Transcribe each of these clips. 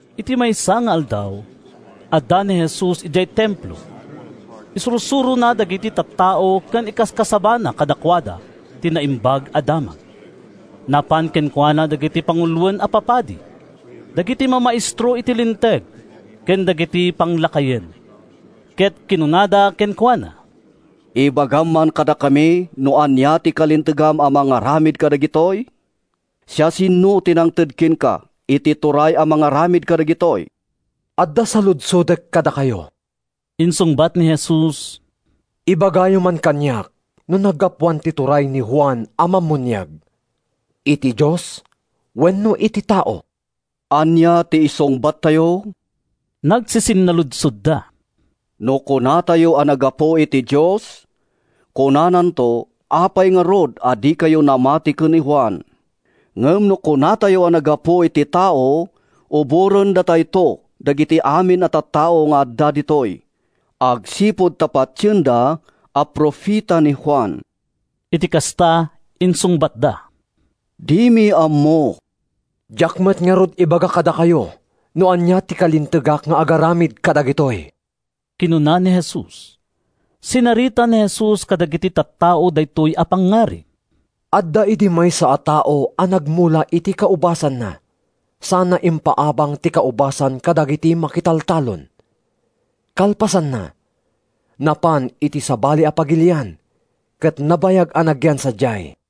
Iti maysa nga aldaw, adda ni Jesus idiay Templo. Isursurona dagiti tattao ken ikaskasabana kadakuada ti Naimbag a Damag. Napan kenkuana dagiti panguloen a papadi, dagiti mamaestro iti Linteg ken dagiti panglakayen ket kinunada kenkuana, “Ibagam man kadakami no ania ti kalintegam a mangaramid kadagitoy? Siasino ti nangted kenka iti turay a mangaramid kadagitoy?” “Adda saludsodek kadakayo,” insungbat ni Jesus. “Ibagayo man kaniak no naggapuan ti turay ni Juan a Mammuniag: iti Dios wenno iti tao?” “Ania ti isungbattayo?” nagsisinnaludsodda. “No kunatayo a naggapu iti Dios, kunananto, ‘Apay ngarud a dikayo namati ken ni Juan?’ Ngem no kunatayo a naggapu iti tao, uborendatayto dagiti amin a tattao nga adda ditoy agsipud ta patienda a profeta ni Juan.” Iti kasta, insungbatda, “Dimi ammo.” “Diak met ngarud ibaga kadakayo no ania ti kalintegak nga agaramid kadagitoy,” kinuna ni Jesus. Sinarita ni Jesus kadagiti tattao daytoy a pangngarig. “Adda idi maysa a tao a nagmula iti kaubasanna sana impaabang ti kaubasan kadagiti makitaltalon. Kalpasanna, napan iti sabali a pagilian ket nabayag a nagyan sadiay.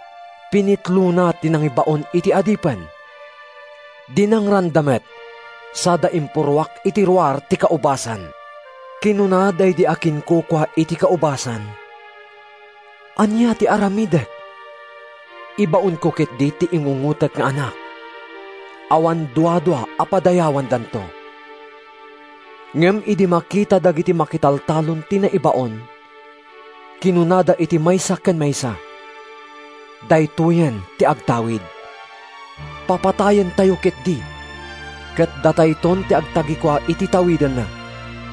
“Pinitlona ti nangibaon iti adipen. Dinangranda met sada impurruak iti ruar ti kaubasan. “Kinuna daydi akinkukua iti kaubasan, ‘Ania ti aramidek? Ibaonko ketdi ti ingungotek nga anak. Awan duadua a padayawandanto.’ “Ngem idi makita dagiti makitaltalon ti naibaon, kinunada iti maysa ken maysa, ‘Daytoyen ti agtawid! Papatayentayo ketdi, ket datayton ti agtagikua iti tawidenna.’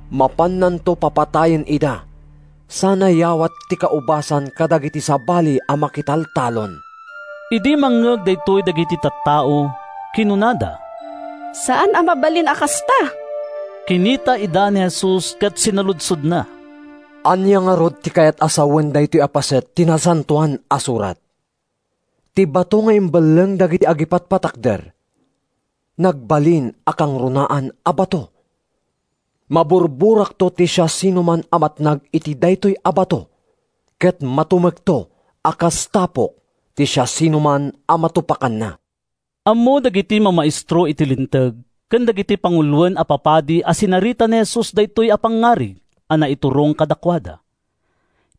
“Mapannanto papatayen ida sana yawat ti kaubasan kadagiti sabali a makitaltalon.” Idi mangngeg daytoy dagiti tattao, kinunada, “Saan a mabalin a kasta.” Kinita ida ni Jesus ket sinaludsodna, “Ania ngarud ti kayat a sawen daytoy a paset ti Nasantoan a Surat? ‘Ti bato nga imbelleng dagiti agipatpatakder, Nagbalin a kangrunaan a bato.’ “Maburburakto ti siasinoman a matnag iti daytoy a bato ket matumekto a kas tapok ti siasinoman a matupakanna.” Ammo dagiti mamaestro iti Linteg ken dagiti panguloen a papadi a sinarita ni Jesus daytoy a pangngarig a naiturong kadakuada.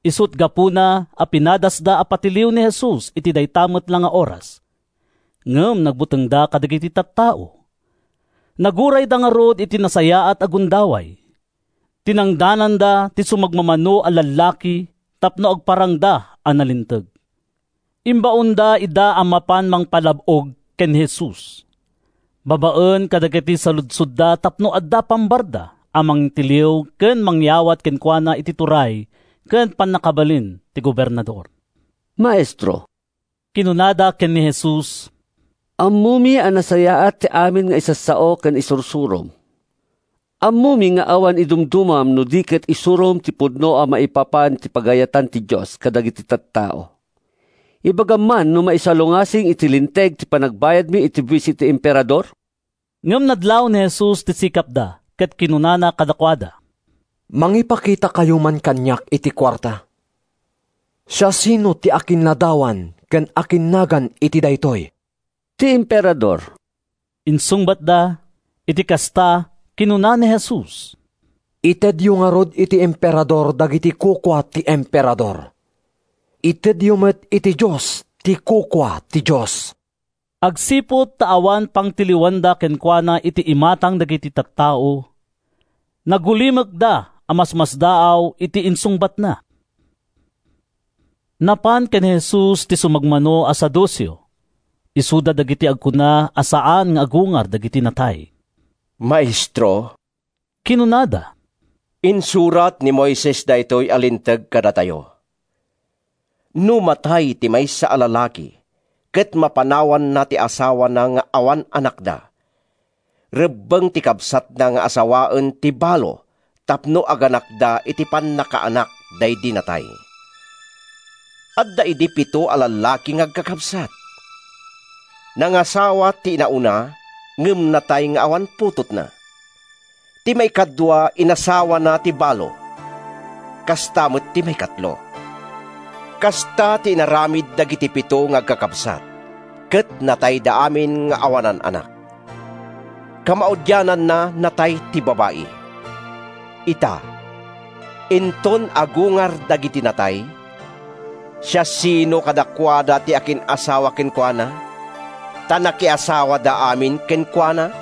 Isut’ gapuna a pinadasda a patiliw ni Jesus iti dayta met la nga oras. Ngem nagbutengda kadagiti tattao. Nagurayda ngarud iti nasayaat a gundaway. Tinangdananda ti sumagmamano a lallaki tapno agparangda a nalinteg. Imbaonda ida a mapan mangpalab-og ken ni Jesus babaen kadagiti saludsodda tapno adda pambaranda a mangtiliw ken mangyawat kenkuana iti turay ken pannakabalin ti gobernador. “Maestro,” kinunada ken ni Jesus, “ammomi a nasayaat ti amin nga isasao ken isursurom. Ammomi nga awan idumdumam no di ket isurom ti pudno maipapan iti pagayatan ti Dios kadagiti tattao. Ibagam man no maisalungasing iti Linteg ti panagbayadmi iti buis iti Emperador?” Ngem nadlaw ni Jesus ti sikapda ket kinunana kadakuada, “Mangipakitakayo man kaniak iti kuarta. Siasino ti akinladawan ken akinnagan iti daytoy?” “Ti Emperador,” insungbatda. Iti kasta, kinuna ni Jesus, “Itedyo ngarud iti Emperador dagiti kukua ti Emperador. Itedyo met iti Dios ti kukua ti Dios.” Agsipud ta awan pangtiliwanda kenkuana iti imatang dagiti tattao, nagulimekda a masmasdaaw iti insungbatna. Napan ken ni Jesus ti sumagmamano a Saduceo. (Isuda dagiti agkuna a saan nga agungar dagiti natay.) “Maestro,” kinunada, “insurat ni Moises daytoy a linteg kadatayo: ‘No matay ti maysa a lalaki ket mapanawanna ti asawana nga awan anakda, rebbeng ti kabsatna nga asawaen ti balo tapno aganakda iti pannakaanak daydi natay.’ “Adda idi pito a lallaki nga agkakabsat. Nangasawa ti inauna, ngem natay nga awan putotna. Ti maikadua inasawana ti balo, kasta met ti maikatlo. Kasta ti inaramid dagiti pito nga agkakabsat ket natayda amin nga awanan anak. Kamaudiananna, natay ti babai. “Ita, inton agungar dagiti natay, siasino kadakuada ti akin-asawa kenkuana? Ta nakiasawada amin kenkuana!”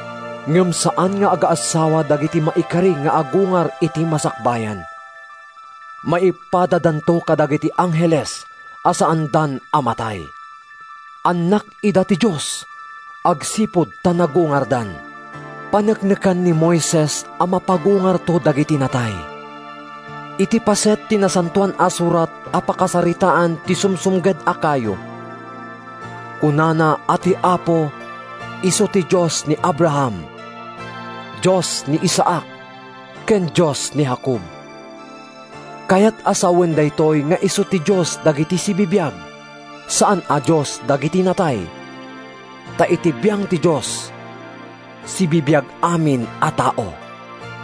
Ngem saan nga agaassawa dagiti maikari nga agungar iti masakbayan. Maipadadanto kadagiti angheles a saandan a matay. Annak ida ti Dios agsipud ta nagungardan. “Paneknekan ni Moises a mapagungarto dagiti natay. Iti paset ti Nasantoan a Surat a pakasaritaan ti sumsumged a kayo, kunana a ti Apo isu ti ‘Dios ni Abraham, Dios ni Isaac, ken Dios ni Jacob.’ Kayat a sawen daytoy nga isu ti Dios dagiti sibibiag, saan a Dios dagiti natay, ta iti biang ti Dios, sibibiag amin a tao.”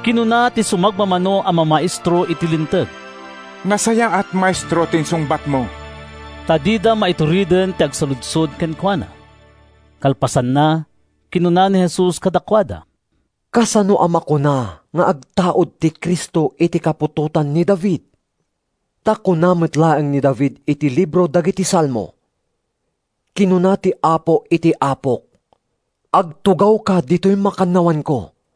Kinuna ti sumagmamano a mamaestro iti Linteg, “Nasayaat, Maestro, ti insungbatmo!” Ta dida maitureden ti agsaludsod kenkuana. Kalpasanna, kinuna ni Jesus kadakuada, “Kasano a makuna nga agtaud ti Cristo iti kaputotan ni David? Ta kuna met laeng ni David iti libro dagiti Salmo: ‘Kinuna ti Apo iti Apok: Agtugawka ditoy makannawanko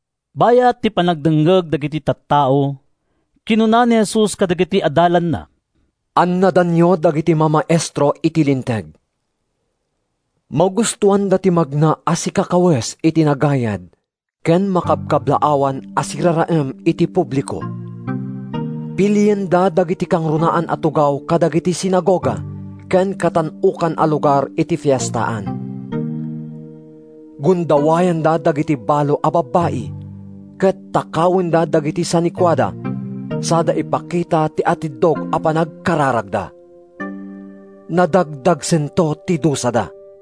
Bayat ti panagdengngeg dagiti tattao, kinuna ni Jesus kadagiti adalanna, “Annadanyo dagiti mamaestro iti Linteg. Magustoanda ti magna a sikakawes iti nagayad ken makabkablaawan a siraraem iti publiko. Pilienda dagiti kangrunaan a tugaw kadagiti sinagoga ken katan-okan a lugar iti fiestaan. Gundawayanda dagiti balo a babbai ket takawenda dagiti sanikuada sada ipakita ti atiddog a panagkararagda. Nadagdagsento ti dusada.”